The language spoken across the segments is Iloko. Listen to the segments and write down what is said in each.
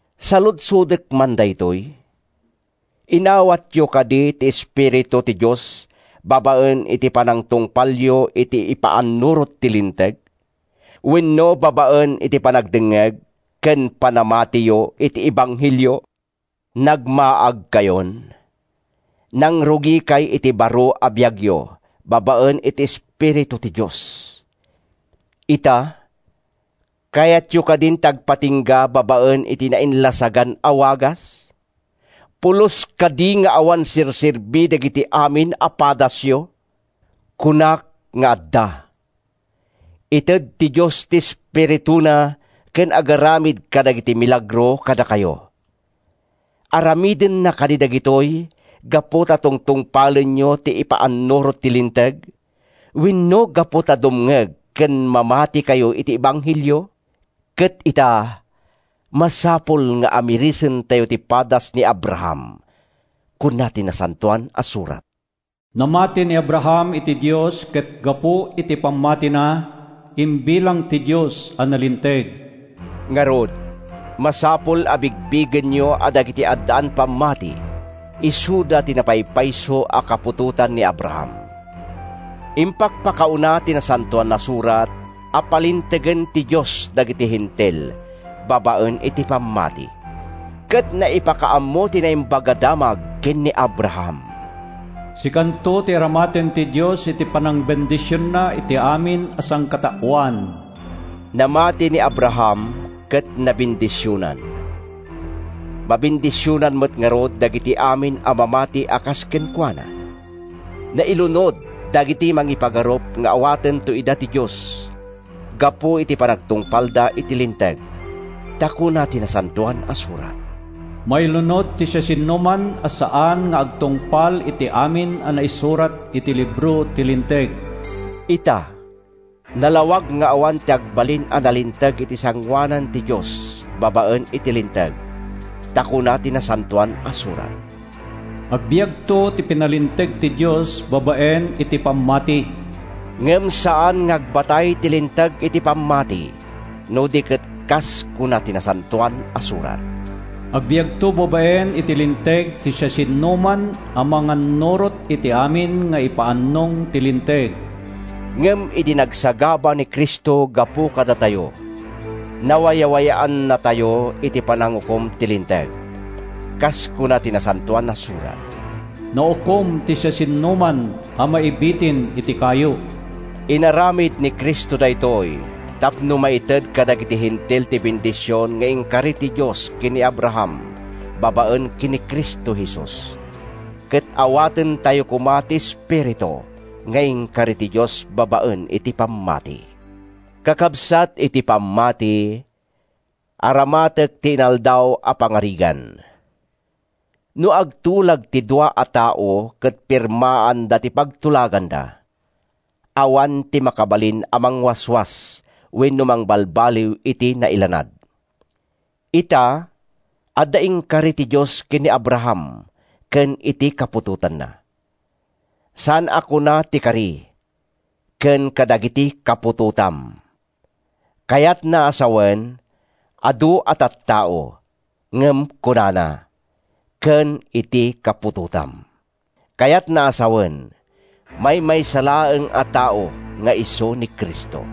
Saludsodek man daytoy: Inawatyo kadi ti Espiritu ti Dios babaen iti panangtungpalyo iti ipaannurot ti Linteg wenno babaen iti panagdengngeg ken panamatiyo iti ebanghelio? Nagmaagkayon! Nangrugikay iti baro a biagyo babaen iti Espiritu ti Dios. Ita, kayatyo kadin ti agpatingga babaen iti nainlasagan a wagas? Pulos kadi nga awan serserbi dagiti amin a padasyo? Kunak nga adda! Ited ti Dios ti Espirituna ken agaramid kadagiti milagro kadakayo. Aramidenna kadi dagitoy gapu ta tungtungpalenyo ti ipaannurot ti Linteg wenno gapu ta dumngeg ken mamatikayo iti ebanghelio? Ket ita, masapul nga amirisentayo ti padas ni Abraham. Kuna ti Nasantoan a Surat, “Namati ni Abraham iti Dios ket gapu iti pammatina, imbilang ti Dios a nalinteg.” Ngarud, masapul a bigbigenyo a dagiti addaan pammati isuda ti napaypayso a kaputotan ni Abraham. Impakpakauna ti Nasantoan a Surat a palintegen ti Dios dagiti Hentil babaen iti pammati. Ket naipakaammo ti Naimbag a Damag ken ni Abraham, “Sikanto ti aramaten ti Dios iti panangbendisionna iti amin a sangkataoan.” Namati ni Abraham ket nabendisionan. Mabendisionan met ngarud dagiti amin a mamati a kas kenkuana. Nailunod dagiti mangipagarup nga awatento ida ti Dios gapu iti panagtungpalda iti Linteg. Ta kuna ti Nasantoan a Surat, “Mailunod ti siasinoman a saan nga agtungpal iti amin a naisurat iti libro ti Linteg!” Ita, nalawag nga awan ti agbalin a nalinteg iti sangoanan ti Dios babaen iti Linteg. Ta kuna ti Nasantoan a Surat, “Agbiagto ti pinalinteg ti Dios babaen iti pammati.” Ngem saan nga agbatay ti Linteg iti pammati, no di ket kas kuna ti Nasantoan a Surat, “Agbiagto babaen iti Linteg ti siasinoman a mangannurot iti amin nga ipaannong ti Linteg.” Ngem idi nagsagaba ni Cristo gapu kadatayo, nawayawayaannatayo iti panangukom ti Linteg. Kas kuna ti Nasantoan a Surat, “Naukom ti siasinoman a maibitin iti kayo.” Inaramid ni Cristo daytoy tapno maited kadagiti Hentil ti bendision nga inkari ti Dios ken ni Abraham babaen ken ni Cristo Jesus, ket awatentayo koma ti Espiritu nga inkari ti Dios babaen iti pammati. Kakabsat iti pammati, aramatek ti inaldaw a pangarigan: No agtulag ti dua a tao ket firmaanda ti pagtulaganda, awan ti makabalin a mangwaswas wenno mangbalbaliw iti nailanad. Ita, adda inkari ti Dios ken ni Abraham ken iti kaputotanna. Saan a kuna ti kari, “ken kadagiti kaputotam,” kayatna a sawen, adu a tattao; ngem kunana, “ken iti kaputotam,” kayatna a sawen, maymaysa laeng a tao nga isu ni Cristo.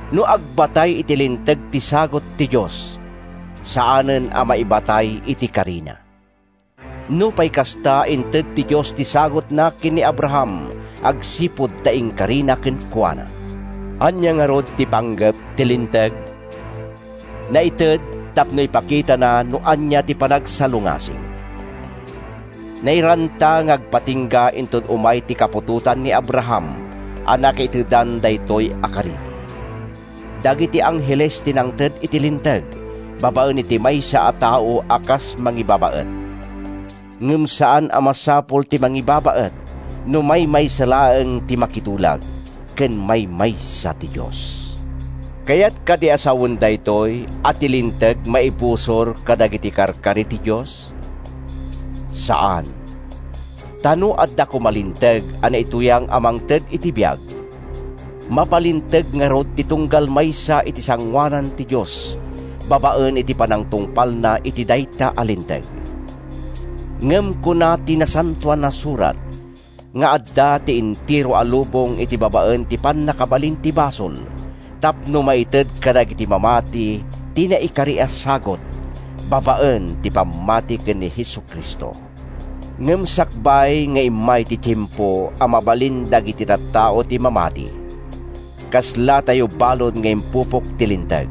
No agbatay iti Linteg ti sagut ti Dios, saanen a maibatay iti karina. Nupay kasta, inted ti Dios ti sagutna ken ni Abraham agsipud ta inkarina kenkuana. Ania ngarud ti panggep ti Linteg? Naited tapno ipakitana no ania ti panagsalungasing. Nairanta nga agpatingga inton umay ti kaputotan ni Abraham a nakaitedan daytoy a kari. Dagiti angheles ti nangted iti Linteg babaen iti maysa a tao a kas mangibabaet. Ngem saan a masapul ti mangibabaet no maymaysa laeng ti makitulag; ket maymaysa ti Dios. Kayat kadi a sawen daytoy a ti Linteg maibusor kadagiti karkari ti Dios? Saan! Ta no adda koma linteg a naituyang a mangted iti biag, mapalinteg ngarud ti tunggal maysa iti sangoanan ti Dios babaen iti panangtungpalna iti dayta a linteg. Ngem kuna ti Nasantoan a Surat nga adda ti entero a lubong iti babaen iti pannakabalin ti basol tapno maited kadagiti mamati ti naikari a sagut babaen ti pammati ken ni Jesu-Cristo. Ngem sakbay nga immay ti tiempo a mabalin dagiti tattao ti mamati, kaslatayo balud nga impupok ti Linteg,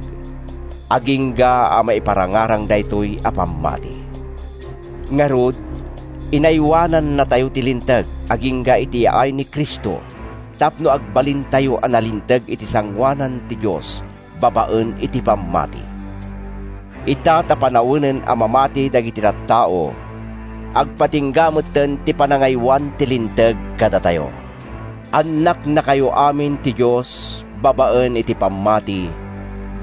agingga a maiparangarang daytoy a pammati. Ngarud, inaywanannatayo ti Linteg agingga iti yaay ni Cristo tapno agbalintayo a nalinteg iti sangoanan ti Dios babaen iti pammati. Ita ta panawenen a mamati dagiti tattao, agpatingga metten ti panangaywan ti Linteg kadatayo. Annaknakayo amin ti Dios babaen iti pammati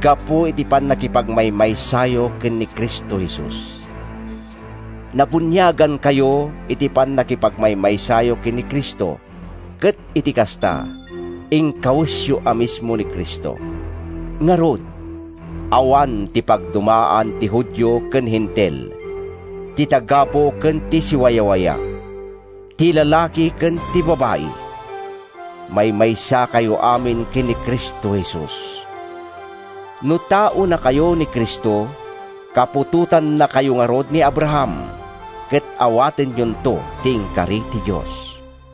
gapu iti pannakipagmaymaysayo ken ni Cristo Jesus. Nabuniagankayo iti pannakipagmaymaysayo ken ni Cristo ket iti kasta, inkawesyo a mismo ni Cristo. Ngarud, awan ti pagdumaan ti Judio ken Hentil, ti tagabu ken ti siwawaya, ti lalaki ken ti babai: maymaysakayo amin ken ni Cristo Jesus. No taonakayo ni Cristo, kaputotannakayo ngarud ni Abraham, ket awatenyonto ti inkari ti Dios.